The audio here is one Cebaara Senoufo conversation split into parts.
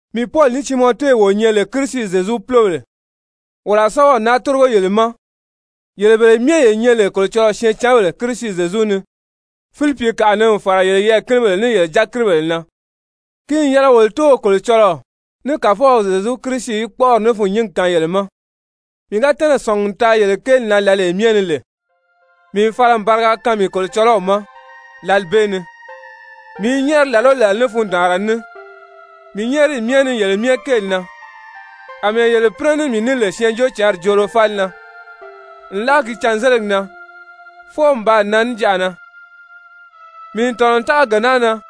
Mii Pɔli ní Timɔte wo nyɛ lè Kirisi Zyezu púlobèle, wolo a sɛ́bɛw naa tórigo yele ma, yele bele myɛ ye nyɛ lè Kolocɔlɔɔ syɛɛncanbèle Kirisi Zyezu ni, Filipikaʔa ni n fàra yele yɛɛ̀kinibèle ní yele dyakiribèle na. Ki n yɛlɛ wolo Tóow Kolocɔlɔɔ ní Kàfɔw Zyezu Kirisi í kpɔ́ʔɔri ní fûnnyingi kaan yele ma! Mii ga tɛ́nɛ̀ sɔ̀ngi n taa yele kéeli na lǎlee myɛ ni lè, mii n fala n bariga kaan mii Kolocɔlɔw ma lǎli bee ni. Mii i nyɛ́ɛri làla o làla ní fundaanra ní mii nyɛ́ɛriyi myɛ ni yele myɛ kéeli na, àmɛɛ yele pínɛ ní mii ní lè Syɛɛnjóocǎnri joolo fáli na, nlaa ki cânzeligi na fwɔɔ n baa nan níjanʔa na. Mii n tɔ̀nɔ n tága gee naa na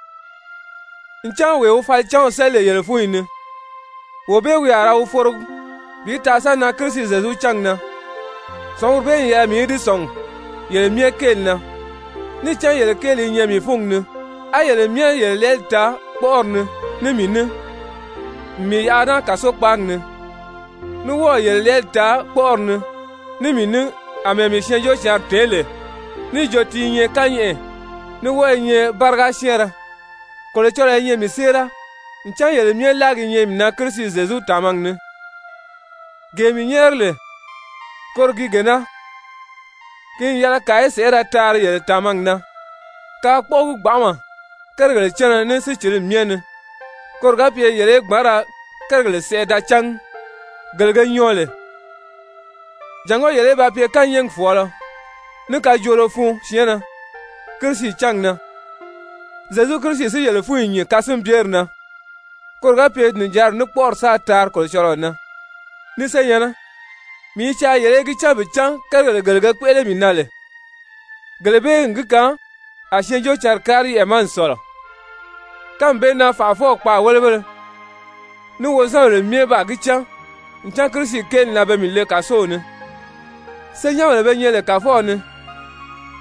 ncan wee wi falicanw séli lè yele fúnyi ni, wee bee wi a ra wi forogi bi taa sa nan Kirisi Zyezu cángi na. Sɔ̀nguri bee n yɛlɛ mii í di sɔ̀ngi yele myɛ kéeli na, níì cán yele kéeli i nyɛ mii fúngi ni, á yele myɛ yele lɛɛli taa kpɔ́ʔɔri ni ní mii ní n mii yaʔa naa kàsokpaagi ni, ní wɔ́ɔ̀ yele lɛɛli taa kpɔ́ʔɔri ni ní mii ní àmɛɛ mii Syɛɛnjóocǎnri tèé lè níì jo ti i nyɛ kányɛʔɛ, ní wɔ́ɔ i nyɛ báriga syɛ́ɛnrɛ. Kolocɔlɔɔ i nyɛ mii séera ncan yele myɛ láagi i nyɛ mii na Kirisi Zyezu tàmagi ni. Gee mii nyɛ́ɛri lè, koro gi gee naa, ki n yɛlɛ kàa í sèʔé ra taari yele tàmagi na kaa kpɔ́ʔɔgi gbanʔama kérigèle cánna ní sícilimi myɛ ni, koro ga pye yele í gbǎn ra kérigèle sɛʔɛ da cángi gele ge nyɔɔ lè, jàngó yele í ba pye kányɛɛgi fɔ̀ɔlɔ ní kajoolo fun syɛɛnnɛ Kirisi cángi na, Zyezu Kirisi si yele fúnyi nyìn kasinbyeri na, koro ga pye nìjanri ní kpɔ́ʔɔri sáā taari Kolocɔlɔɔ na. Ni senyɛ̀nnɛ, mii i caa yele í gi cán bi cán kérigèle gele ge kpéʔele mii na lè, gele bee n gi kaan a Syɛɛnjóocǎnri kári yɛʔɛ ma n sɔ̀lɔ. Kánmi bee na fànʔafɔw kpaàwelebéle ní wozanbèle myɛ baa gi cán ncan Kirisi kéeli na pe mii le kàsow ni. Senyɛnbèle be nyɛ lè Kàfɔw ni,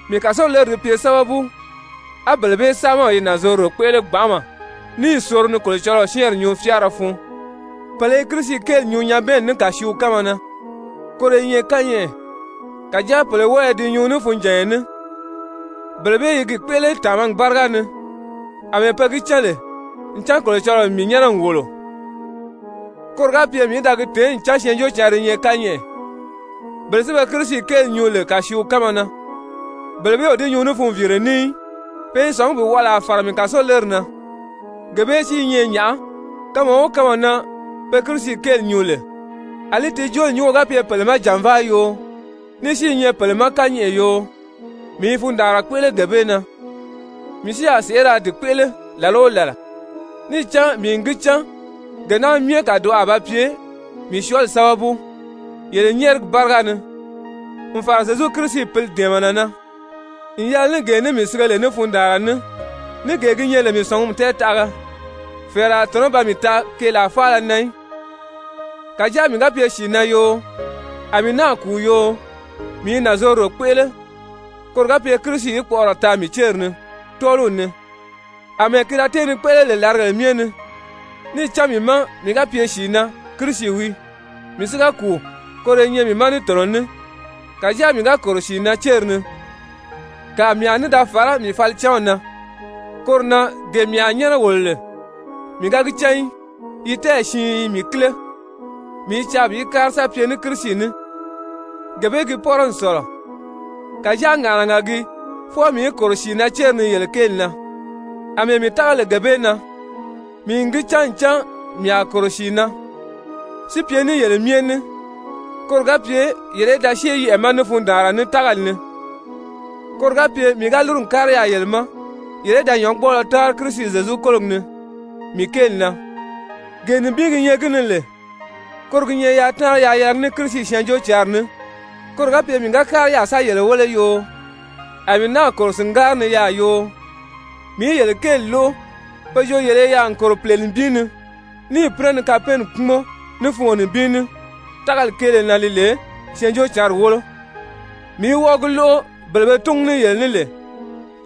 mii kàsoleri di pye sábabu, á bele bee saamaw i nànzorodo kpéʔele gbanʔama níì soro ni Kolocɔlɔɔ syɛ́ɛnri nyuu fyáara fun. Pèle i Kirisi kéeli nyuu nyabɛɛnni ní kàsiiw kánma na, koro i nyɛ kányɛʔɛ, kàjáa pèle wɔ́ɔ i di nyuu ní funjànya ní. Bele bee i gi kpéʔele tàmagi báriga ni àmɛɛ pe gi cán lè ncan Kolocɔlɔɔ n mii nyɛ́nɛ n wòlo koro ga pye mii í da gi tèé ncan Syɛɛnjóocǎnri i nyɛ kányɛʔɛ, bele si be Kirisi kéeli nyuu lè kàsiiw kánma na, bele bee o di nyuu ní funviire ní í. Pe i sɔ̀ngí bi wɔʔɔlaa fàra mii kàsoleri na. Gee bee si i nyɛ nyàʔá? Kanma o kanma na pe Kirisi kéeli nyuu lè, àlí ti jooli nyúngo ga pye pèle ma jànvaa yoo, ní si i nyɛ pèle ma kányɛʔɛ yoo, mii i fundaanra kpéʔele gee bee na. Mii si a sèʔé ra di kpéʔele làla o làla. Níì cán mii n gi cán gee naa myɛ kàdoʔo a ba pye mii syɔɔli sábabu yele nyɛ́ɛrigi báriga ni n fàra Zyezu Kirisi Pǐli dɛ̀ɛmɛnɛ na. N yɛlɛ ní gee ní mii sige lè ní fundaanra ní, ní gee gi nyɛ lè mii sɔ̀ngumi tɛɛtaʔaga, fɛ̀ɛrɛ a tɔ̀nɔ́ ba mii taa keelaa faala na í. Kàjáa mii ga pye sìi na yoo, a mii náà kùu yoo, mii i nànzorodo kpéʔele koro ga pye Kirisi í kpɔʔɔrɔ taa mii céri ni tɔ́ɔliw ni àmɛɛ ki da tée ni kpéʔele lè làrigèle myɛ ni. Níì cán mii má, mii ga pye sìi na, Kirisi wii, mii si ga kùu, koro i nyɛ mii ma ní tɔ̀nɔ ní. Kàjáa mii ga kòro sìi na céri ni, kàa mii a ní da fàrá mii falicanw na. Koro na gee mii a nyɛ́nɛ wòlo lè, mii ga gi cán í. Yi tɛ́ɛyi siin i mii kíle, mii i caa bi kári sa pye ní Kirisi ní, gee bee gi pɔ́rɔ n sɔ̀lɔ. Kàjáa ŋàʔanaga gii, fwɔɔ mii í kòro sìi na céri ni yele kéeli na. Amɛɛ mii tága lè gee bee na, mii n gi cán ncan mii a kòro sìi na, si pye ní yele myɛ ní koro ga pye yele í da syée yɛʔɛ̀ ma ní fundaanra ní, tágali ni, koro ga pye mii ga lúru n kári yaà yele ma, yele í da nyɔ̌ngbɔɔlɔ táanri Kirisi Zyezu kólogi ni mii kéeli na. Gee nibin gi nyɛ gi ni lè, koro gi nyɛ yaa táanri yaa yɛlɛgi ní Kirisi Syɛɛnjóocǎnri ní, koro ga pye mii ga kári yaà sa yele wéle yoo, a mii náà kòro sìngári ni yaà yoo, mii í yele kéeli lóʔo pe jo yele i yaà n kòro pìle nibin ni, níì pínɛ ni kapɛɛnni kpúmɔn ní fungo nibin ní tágali kéele na li lè Syɛɛnjóocǎnri wólo, mii í wɔ́ɔ gi lóʔo bele be túngu ní yele ní lè,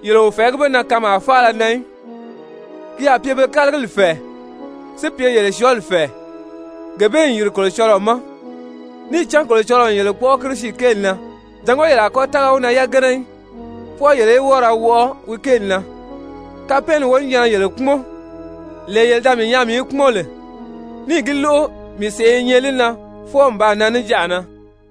yele o fɛ̀ɛgí be na kanmaa faala na í. Ki a pye be ma pe kálagili fɛ̀ɛ, si pye yele syɔɔli fɛ̀ɛ, gee bee n yìri Kolocɔlɔɔ ma. Níì cán Kolocɔlɔɔ n yele kpɔ́ʔɔ Kirisi kéeli na jàngó yele a kɔ́ tága wi na yagana í, fwɔɔ yele í wɔ́ɔ ra wɔʔɔ wi kéeli na. Kapɛɛnni wonijanna yele kpúmɔn, lee yele da mii nyaa mii i kpúmɔn lè, níì gi lóʔo mii sèʔé i nyɛ li na fwɔɔ n baa nan níjanʔa na.